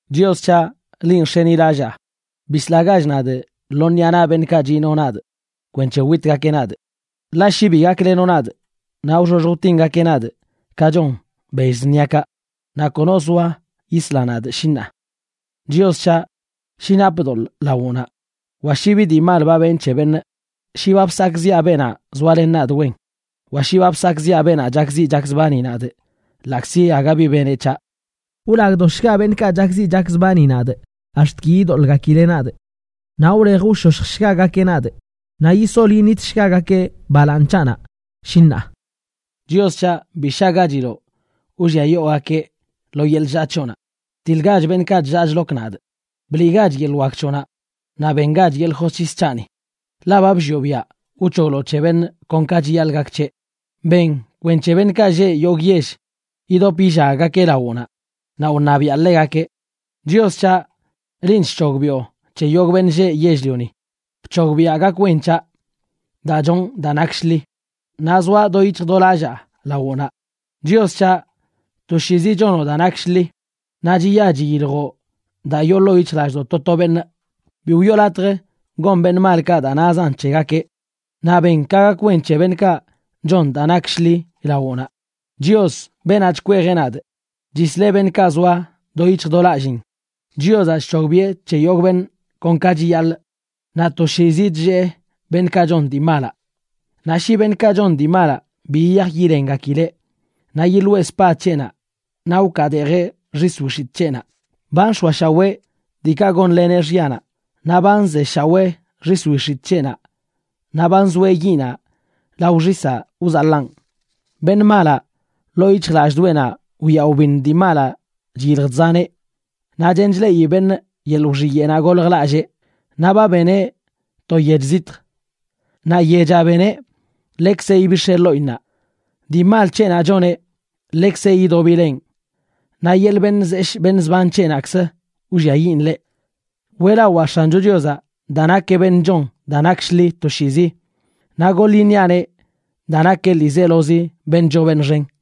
Chios c̱haꞌ, linꞌ nx̱enilallaa. Bislagach nadꞌ lo ṉiꞌa naꞌ beṉꞌkaꞌ chino nadꞌ kwenc̱he witgakeꞌ nadꞌ. Ḻaꞌ shi bi gaklenoꞌ nadꞌ, naꞌ wxoxj wtingakeꞌ nadꞌ ka chon bell zṉiakaꞌ, naꞌ kono zoa yisla nadꞌ, shi ṉaa. Chios c̱haꞌ, shi napꞌ doḻꞌ lawoꞌnaꞌ, wa shi bi dii mal ba benꞌ c̱he beṉꞌ, shi ba bsakꞌziꞌa beenaꞌ zoalen nadꞌ wen, wa shi ba bsakꞌziꞌa beenaꞌ chakziꞌ chakzbani nadꞌ ḻaꞌkzi aga bi beneꞌ c̱haꞌ, wlagdoshga beṉꞌkaꞌ chakziꞌ chakzbani nadꞌ ax̱t ki yidoḻꞌgakileꞌ nadꞌ, naꞌ wlej wshoshjshgagakeꞌ nadꞌ, naꞌ yisol yiṉitshgagakeꞌ balaaṉ c̱haꞌnaꞌ, shi ṉaa. Chios c̱haꞌ, bi shaꞌgachiloꞌ wlliayoogakeꞌ lo yeḻꞌ chllaa c̱hoꞌnaꞌ. Btiḻgach beṉꞌkaꞌ chllaa chlok nadꞌ. Bliꞌgach yeḻꞌ wak c̱hoꞌnaꞌ, naꞌ bengach yeḻꞌ josc̱his c̱haꞌni, ḻaꞌ ba bllioꞌ biaꞌ wc̱hogloꞌ c̱he beṉꞌ kon ka chiyaḻꞌ gak c̱heꞌ. Ben kwenc̱he beṉꞌkaꞌ lleꞌ yogꞌ yell yidop yillaggakeꞌ lawoꞌnaꞌ, naꞌ wṉabiaꞌ ḻegakeꞌ. Chios c̱haꞌ, linꞌ chc̱hogbiꞌo c̱he yogꞌ beṉꞌ lleꞌ yell-lioni. Bc̱hogbiaꞌ gak wen c̱haꞌ daa chonꞌ daa nak shḻi, naꞌ zoaꞌ do yic̱hj do lallaa lawoꞌnaꞌ. Chios c̱haꞌ, toshiizi chonoꞌ daa nak shḻi, naꞌ chiya chiyiljoꞌ daa yoo ḻoo yic̱hjlallꞌdoꞌ to to beṉꞌ. Bi wiꞌo latj gon beṉꞌ malkaꞌ daa nazan c̱hegakeꞌ, naꞌ ben ka gak wen c̱he beṉꞌkaꞌ chon daa nak shḻi lawoꞌnaꞌ. Chios, beenaꞌ chkweejeꞌ nadꞌ, chisleꞌ beṉꞌkaꞌ zoa do yic̱hj do lallin. Chiozaꞌ chc̱hogbiꞌe c̱he yogꞌ beṉꞌ kon ka chiyaḻꞌ, naꞌ toshiizi chllee beṉꞌkaꞌ chon dii malaꞌ. Naꞌ shi beṉꞌkaꞌ chon dii malaꞌ bi yiyaj yilengakileꞌ, naꞌ yiḻoeꞌ spad c̱heꞌnaꞌ naꞌ wkaadeejeꞌ xis wix̱itꞌ c̱heꞌnaꞌ. Ba nx̱oashawee diikaꞌ gonleneꞌ xyanaꞌ. Naꞌ ba nzeshawee xis wix̱itꞌ c̱heꞌnaꞌ naꞌ ba nzoeꞌ yiꞌnaꞌ lao xisaꞌ wzaḻaꞌn. Beṉꞌ malaꞌ, ḻoo yic̱hjlallꞌdoꞌenaꞌ wya wbiṉ dii malaꞌ chyilj chzaneꞌ, naꞌ chen chleꞌi beṉꞌ yeḻꞌ wxiyeꞌnaꞌ goljlallee. Naꞌ ba beneꞌ to yech zitj, naꞌ yechaꞌ beneꞌ, ḻekzeꞌ ibix̱eꞌ ḻoꞌinnaꞌ. Dii mal c̱heꞌnaꞌ choneꞌ, ḻekzeꞌ yidobileꞌn; naꞌ yeḻꞌ beṉꞌ zeshꞌ beṉꞌ zban c̱heꞌnaꞌkzə wlliayiꞌn ḻeꞌ. Weꞌlawaa X̱ancho Chiozaꞌ daa nakeꞌ beṉꞌ chon daa nak shḻi toshiizi. Naꞌ goḻ iṉiaꞌneꞌ daa nakeꞌ ḻiizelozi beṉꞌ choo beṉꞌ xen.